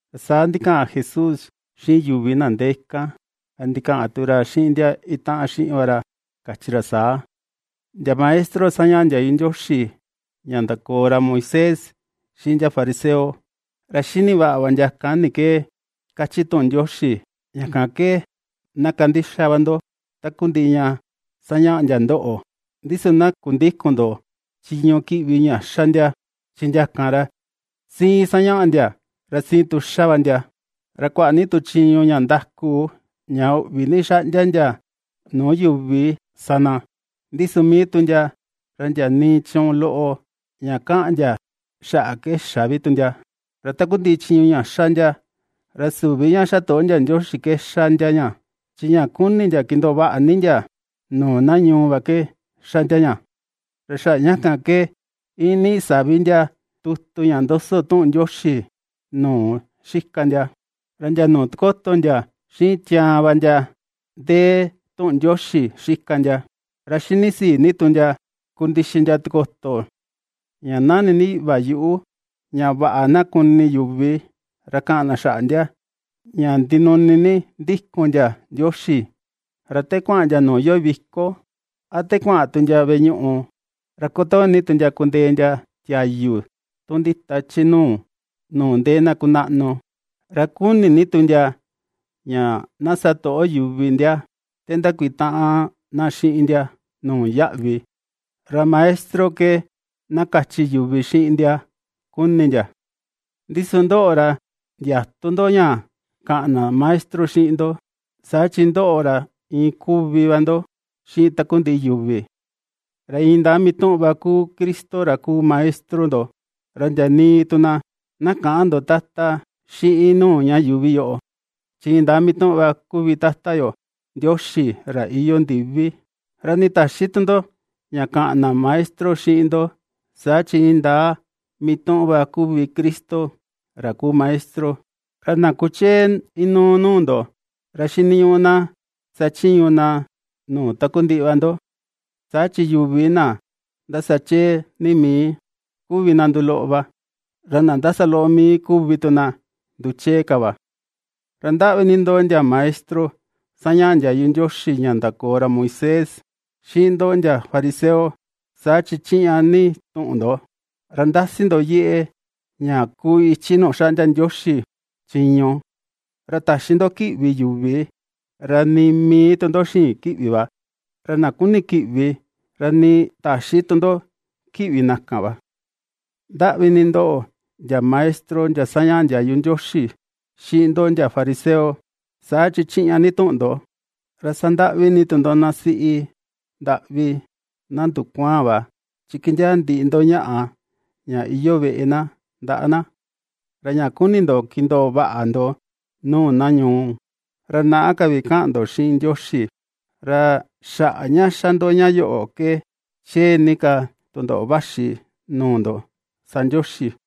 Ra saa ndikaꞌan Jesús xiꞌin yuvi na ndee kan, ra ndikaꞌan tu ra xiꞌin ndia itaꞌan xiꞌin ra va ra kachi ra saa: ―Ndia maestro sañaꞌa ndiayu Ndioxi ña ndakoo ra Moisés, xiꞌin ndia fariseo, ra xini vaꞌa va ndia kan ni ke kachi tuꞌun Ndioxi. Ña kan ke, na kandixa va ndo takundiꞌi ña sañaꞌa ndia ndoꞌo, ndi su na kundïkun ndo chiñu kiꞌvi ña xa ndia, chi ndia kan, ra siin sañaꞌa ndia, ra siin tu xa va ndia. Ra kuaꞌa ni chiñu ña ndaku, ña uꞌvi ni xaꞌndia ndia nuu yuvi sa na, ndi su mii tu ndia, ra ndia nii chiñu loꞌo ña kaꞌan ndia xaꞌa ke xä vi ndia. Ra takundiꞌi chiñu ña xa ndia, ra süvi ña xatoꞌo ndia Ndioxi ke xa ndia ña, chi ña kuni ndia kindoo vaꞌa ni ndia nuu na ñuu va ke xa ndia ña. Ra xaꞌa ña kan ke iin niꞌi savi ndia tutu ña ndoso tuꞌun Ndioxi nuu xika ndia, ra ndia nuu tikoto ndia xiꞌin tiaan va ndia ndee tuꞌun Ndioxi xika ndia, ra xinisii ni tu ndia kundixi ndia tikoto ña nani ni iꞌva yuꞌu va ña vaꞌa na kuni yuvi ra kaꞌan na xaꞌa ndia, ña ndinuni ni ndikun ndia Ndioxi. Ra te kuaꞌan ndia nuu iyoo viko, a te kuaꞌan tu ndia veꞌe ñuꞌu, ra kutoo ni ndia kundee ndia tiayu tu ndita chi nuu, nuu ndee na kunaꞌnu. Ra kuni ni tu ndia ña na satoꞌo yuvi ndia, te ndakutaꞌan na xiꞌin ndia nuu yaꞌvi, ra “maestro” ke na kachi yuvi xiꞌin ndia kuni ndia. ’Ndi su ndoꞌo ra ndiätu ndo ña kaꞌan na “maestro” xiꞌin ndo, saa chi ndoꞌo ra iin kuvi va ndo xiꞌin takundiꞌi yuvi, ra indaa mituꞌun va kuu Cristo ra kuu Maestro ndo. Ra ndia nii tu na, na käꞌan ndo “tata” xiꞌin nuu ña yuuvi yoꞌo, chi indaa mituꞌun va kuvi Tata yo Ndioxi ra iyoo ndivi. Ra nii täxi tu ndo ña kaꞌan na “maestro” xiꞌin ndo, saa chi indaa mituꞌun va kuu Cristo ra kuu Maestro. Ra na kuchee inuu nuu ndo, ra xiniñuꞌu na sachiñu na nuu takundiꞌi va ndo. Saa chi yuvi na ndasa chee ni mii, kuvi na nduu loꞌo va, ra na ndasa loꞌo mii kuvi tu na nduchee ka va. ’Ra ndaꞌvi ni ndoꞌo, ndia maestro sañaꞌa ndiayu Ndioxi ña ndakoo ra Moisés, xiꞌin ndoꞌo ndia fariseo, saa chi chiꞌña ni tuꞌun ndo, ra ndasi ndo yeꞌe ña kuu ichi nuu xaꞌndia Ndioxi chiñu, ra täxi ndo kiꞌvi yuvi, ra nii mii tu ndo xïin kiꞌvi va, ra na kuni kiꞌvi, ra nii täxi tu ndo kiꞌvi na kan va. ’Ndaꞌvi ni ndoꞌo, ndia maestro ndia sañaꞌa ndiayu Ndioxi, xiꞌin ndoꞌo ndia fariseo, saa chi chiꞌña ni tuꞌun ndo, ra sandaꞌvi ni tu ndo na siꞌi ndaꞌvi na ndukuaan va, chi kindiaa ndiꞌi ndo ñaꞌa ña iyoo veꞌe na ndaꞌa na, ra ña kuni ndo kindoo vaꞌa ndo nuu na ñuu, ra naꞌa ka vi kaꞌan ndo xiꞌin Ndioxi. Ra xaꞌa ña xa ndo ña yoꞌo ke chee ni ka tundoꞌo vaxi nuu ndo sa Ndioxi.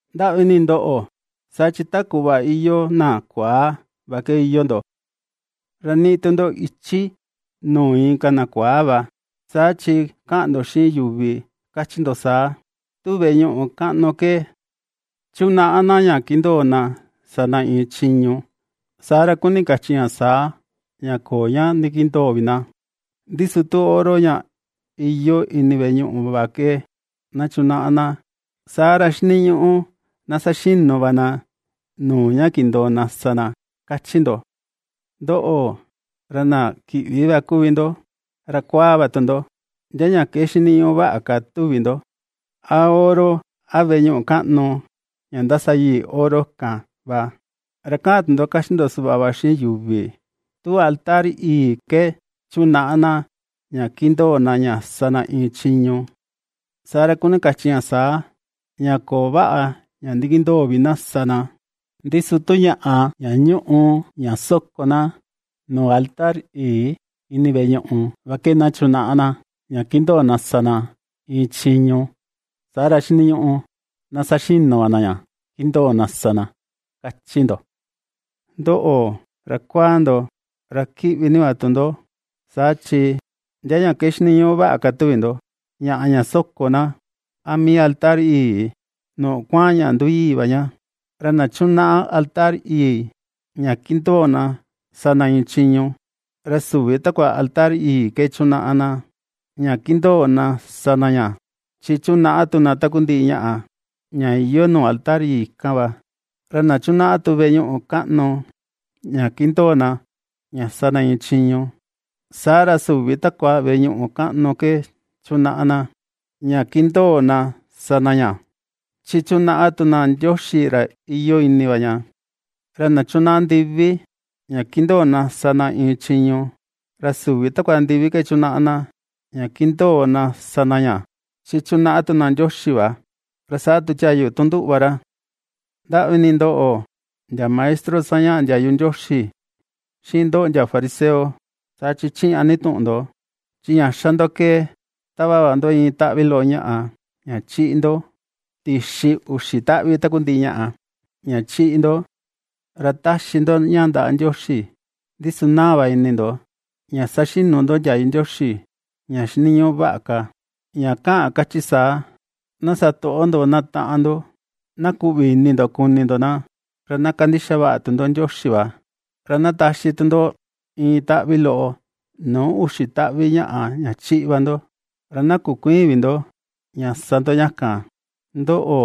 ’Ndaꞌvi ni ndoꞌo, saa chi ta kuꞌva iyoo na kuaa va ke iyoo ndo, ra niꞌi tu ndo ichi nuu inka na kuaa va, saa chi kaꞌan ndo xiꞌin yuvi kachi ndo saa: “Tu veꞌe ñuꞌu kaꞌnu ke na chunaꞌa na ña kindoo na sa na iin chiñu, saa ra kuni kachi ña saa ña köo ña ndikindoo vi na, ndi su tu oro ña iyoo ini veꞌe ñuꞌu kaꞌnu va ke na chunaꞌa na, saa ra xiniñuꞌu na saxinu va na nuu ña kindoo na sa na”, kachi ndo. ¡Ndoꞌo, ra na kiꞌvi va kuvi ndo, ra kuaa va tu ndo! ¿Ndia ña ke xiniñuꞌu vaꞌa ka tuvi ndo: a oro, a veꞌe ñuꞌu kaꞌnu, ña ndasa yii oro kan va? Ra kaꞌan tu ndo kachi ndo suꞌva va xiꞌin yuvi: “Tu Altar yii ke na chunaꞌa na ña kindoo na ña sa na iin chiñu, saa ra kuni kachi ña saa, ña köo vaꞌa ña ndikindoo vi na sa na; ndi su tu ñaꞌa ña ñuꞌu ña soko na nuu altar yii ini veꞌe ñuꞌu va ke na chunaꞌa na ña kindoo na sa na iin chiñu, saa ra xiniñuꞌu na saxinu va na ña kindoo na sa na”, kachi ndo. Ndoꞌo, ra kuaa ndo, ra kiꞌvi ni va tu ndo, saa chi ¿ndia ña ke xiniñuꞌu vaꞌa ka tuvi ndo, ñaꞌa ña soko na, a mii altar yii, nuu kuaꞌan ña nduyii va ña? Ra na chunaꞌa altar yii, ña kindoo na sa na iin chiñu ra süvi takua altar yii ke chunaꞌa na ña kindoo na sa na ña, chi chunaꞌa tu na takundiꞌi ñaꞌa, ña iyoo nuu altar yii kan va. Ra na chunaꞌa tu veꞌe ñuꞌu kaꞌnu ña kindoo na ña sa na iin chiñu, saa ra süvi takua veꞌe ñuꞌu kaꞌnu ke chunaꞌa na ña kindoo na sa na ña, chi chunaꞌa tu na Ndioxi ra iyoo ini va ña. Ra na chunaꞌa ndivi ña kindoo na sa na iin chiñu, ra süvi takua ndivi ke chunaꞌa na ña kindoo na sa na ña, chi chunaꞌa tu na Ndioxi va, ra saa tu tiayu tun nduꞌu va ra. ’Ndavi ni ndoꞌo, ndia maestro sañaꞌa ndiayu Ndioxi, xiꞌin ndoꞌo ndia fariseo, saa chi chiꞌña ni tuꞌun ndo, chi ña xa ndo ke tava va ndo iin taꞌvi loꞌo ñaꞌa ña chiꞌi ndo tixi uxi taꞌvi takundiꞌi ñaꞌa, ña chiꞌi ndo, ra taxi ndo ña ndaꞌa Ndioxi, ndi su naa va ini ndo ña saxinu ndo ndiayu Ndioxi ña xiniñuꞌu vaꞌa ka, ña kaꞌan kachi saa: na satoꞌo ndo na taꞌan ndo, na kuꞌvi ini ndo kuni ndo na, ra na kandixa vaꞌa tu ndo Ndioxi va; ra na taxi tu ndo iin taꞌvi loꞌo nuu uxi taꞌvi ñaꞌa ña chiꞌi va ndo, ra na kukuïin vi ndo ña sa ndo ña kan. Ndoꞌo,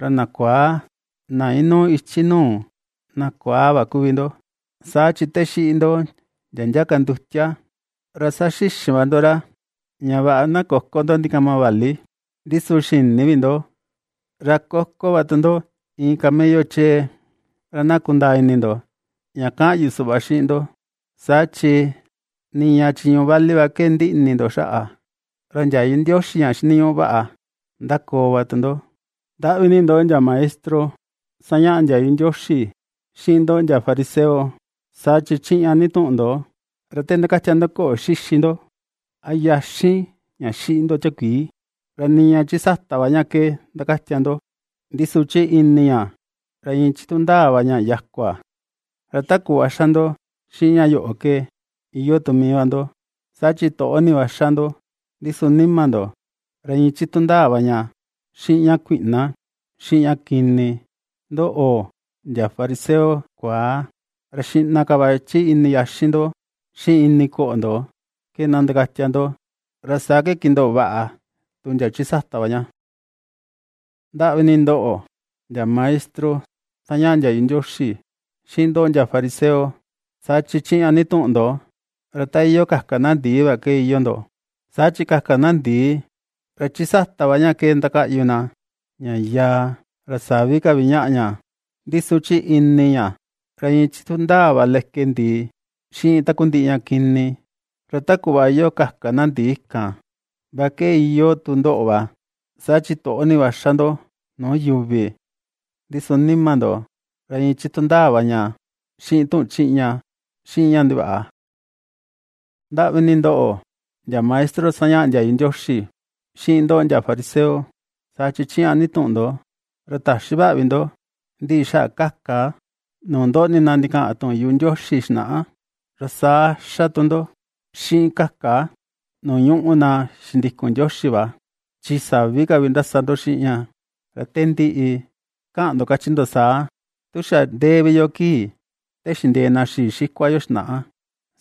ra na kuaa, na inuu ichi nuu na kuaa va kuvi ndo, saa chi te xiꞌi ndo ndia ndia ka ndutia, ra saxixin va ndo ra ña vaꞌa na köko ndo ndikama vali, ndi su xïni vi ndo, ra koko va tu ndo iin camello chee. Ra na kundaa ini ndo ña kaꞌan yu suꞌva xiꞌin ndo, saa chi, niña chiñu vali va ke ndiꞌi ni ini ndo xaꞌa, ra ndiayu Ndioxi ña xiniñuꞌu vaꞌa, ndakoo va tu ndo. ’Ndaꞌvi ni ndoꞌo ndia Maestro sañaꞌa ndiayu Ndioxi, xiꞌin ndoꞌo ndia fariseo, saa chi chiꞌña ni tuꞌun ndo, ra te ndakatia ndo koꞌo xixi ndo, a yaxin ña xiꞌi ndo tiakuii, ra niña chi sata va ña ke ndakatia ndo, ndi su chi ini ña, ra iin chitu ndaa va ña yakua. Ra ta kuꞌva xa ndo xiꞌin ña yoꞌo ke, iyoo tu mii va ndo, saa chi toꞌo ni va xa ndo, ndi su nima ndo ra iin chitu ndaa va ña xiꞌin ña kuiꞌna xiꞌin ña kini. Ndoꞌo, ndia fariseo kuaa, ra xiꞌna ka va chi ini yaxin ndo xiꞌin ini koꞌo ndo ke na ndakatia ndo, ra saa ke kindoo vaꞌa tu ndia chi sata va ña. ’Ndaꞌvi ni ndoꞌo, ndia maestro sañaꞌa ndiayu Ndioxi xiꞌin ndoꞌo ndia fariseo, saa chi chiꞌña ni tuꞌun ndo, ra ta iyoo kaka na ndii va ke iyoo ndo, saa chi kaka na ndii, ra chi sata va ña ke ndakaꞌyu na, ña yaa, ra sa̱ví ka vi ñaꞌa ña, ndi su chi ini ña, ra iin chitu ndaa va leke ndii, xiꞌin takundiꞌi ña kini. Ra ta kuꞌva iyoo kaka na ndii kan va ke iyoo tu ndoꞌo va, saa chi toꞌo ni va xa ndo nuu yuvi, ndi su nima ndo, ra iin chitu ndaa va ña xiꞌin tuꞌun chiꞌña xiꞌin ña ndivaꞌa. ’Ndaꞌvi ni ndoꞌo ndia maestro sañaꞌa ndiayu Ndioxi, xiꞌin ndoꞌo ndia fariseo, saa chi chiꞌña ni tuꞌun ndo, ra täxi vaꞌa vi ndo, ndiꞌi xaꞌa kaka nuu ndoꞌni na ndikaꞌan tuꞌun yuꞌu Ndioxi xinaꞌa, ra saa xa tu ndo, xiꞌin kaka nuu ñuꞌu na xindikun Ndioxi va, chi savi ka vi ndasa ndo xiꞌin ña, Ra te ndiꞌi, ^kaꞌan ndo kachi ndo saa: “Tu xa ndee vi yo kii te xindee na xii xikua yo xinaꞌa,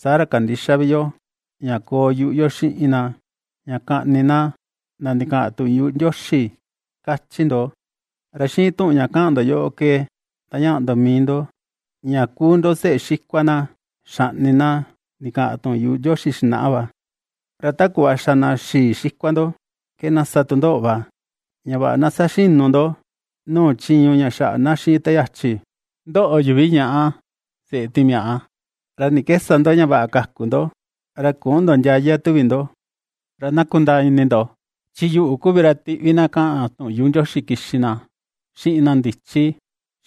saa ra kandïxa vi yo, ña koo yuꞌu yo xiꞌin na, ña kaꞌni na na ndikaꞌan tuꞌun yuꞌu Ndioxi”, kachi ndo. Ra xiꞌin tuꞌun ña kaꞌan ndo yoꞌo ke, ndañaꞌa ndo mii ndo ña kuu ndo seꞌe xikua na xaꞌni na ndikaꞌan tuꞌun yuꞌu Ndioxi xinaꞌa va. ¡Ra ta kuꞌva xa na xii xikua ndo ke na sa tu ndoꞌo va, ña vaꞌa na saxinu ndo nuu chiñu ña xaꞌa na xiꞌin te yachi! Ndoꞌo, yuvi ñaꞌa, seꞌe timiaꞌa, ¿ra ni ke sa ndo ña vaꞌa kaku ndo, ra küꞌun ndo ndiaya, tuvi ndo? Ra na kundaa ini ndo, chi yuꞌu kuvi ra tiꞌvi na kaꞌan tuꞌun yuꞌu Ndioxi kixi na, xiꞌin na ndichi,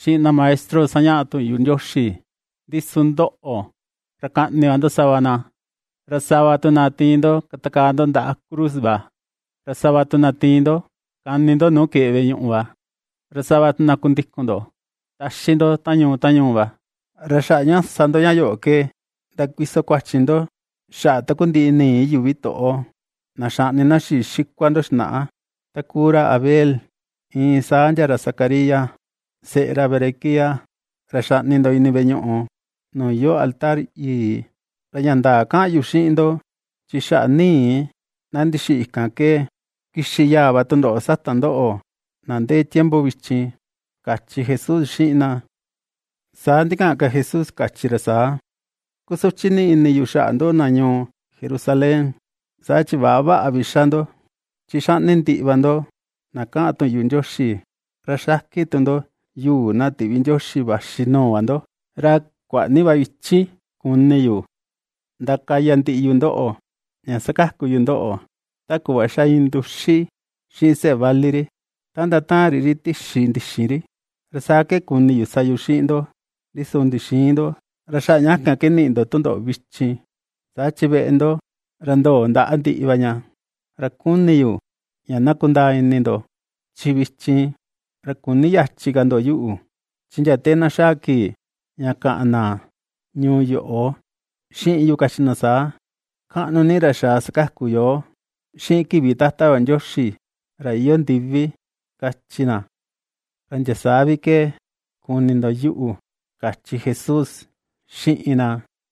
xiꞌin na maestro sañaꞌa tuꞌun Ndioxi; ndi su ndoꞌo, ra kaꞌni va ndo sava na, ra sava tu na tiin ndo katakaa ndo ndaꞌa cruz va, ra sava tu na tiin ndo kani ndo nuu keꞌe veꞌe ñuꞌu va, ra sava tu na kundikun ndo taxi ndo ta ñuu ta ñuu va. Ra xaꞌa ña sa ndo ña yoꞌo ke, ndakuiso kuachi ndo xaꞌa takundiꞌi nii yuvi toꞌo, na xaꞌni na xii xikua ndo xinaꞌa ta kuu ra Abel, iin saa ndia ra Zacarías, seꞌe ra Berequías, ra xaꞌni ndo ini veꞌe ñuꞌu nuu iyoo altar yii. Ra ña ndaa kaꞌan yu xiꞌin ndo, chi xaꞌa nii na ndixiꞌi kan ke, kixi yaa va tundoꞌo sata ndoꞌo na ndee tiempo vichin ―kachi Jesús xiꞌin na. Saa ndikaꞌan Jesús kachi ra saa: ―¡Kusuchi ni ini yu xaꞌa ndoꞌo na ñuu Jerusalén, saa chi väꞌa vaꞌa vi ^xa ndo, chi xaꞌni ndiꞌi va ndo na kaꞌan tuꞌun yuꞌu Ndioxi, ra xakin tu ndo yuu na tiꞌvi Ndioxi vaxi nuu va ndo! ¡Ra kuaꞌa ni va ichi kuni yu ndakaya ndiꞌi yu ndoꞌo ña sakaku yu ndoꞌo, ta kuꞌva ^xa iin nduxi xiꞌin seꞌe vali ri, ta ndataan ri ri tixi ndixin ri, ra saa ke kuni yu sa yu xiꞌin ndo, ndi su ndixïin ndo! Ra xaꞌa ña kan ke niꞌi ndo tundoꞌo vichin, saa chi veꞌe ndo, ra ndoo ndaꞌa ndiꞌi va ña, ra kuni yu ña na kundaa ini ndo, chi vichin, ra küni yachi ka ndo yuꞌu, chi ndia te na xaa kii, ña kaꞌan na ñuu yoꞌo xiꞌin yu kachi na saa: “¡Kaꞌnu ni ra xaa sakaku yoo xiꞌin kivi Tata yo Ndioxi ra iyoo ndivi!”, kachi na, ra ndia saa vi ke kuni ndo yuꞌu ―kachi Jesús xiꞌin na.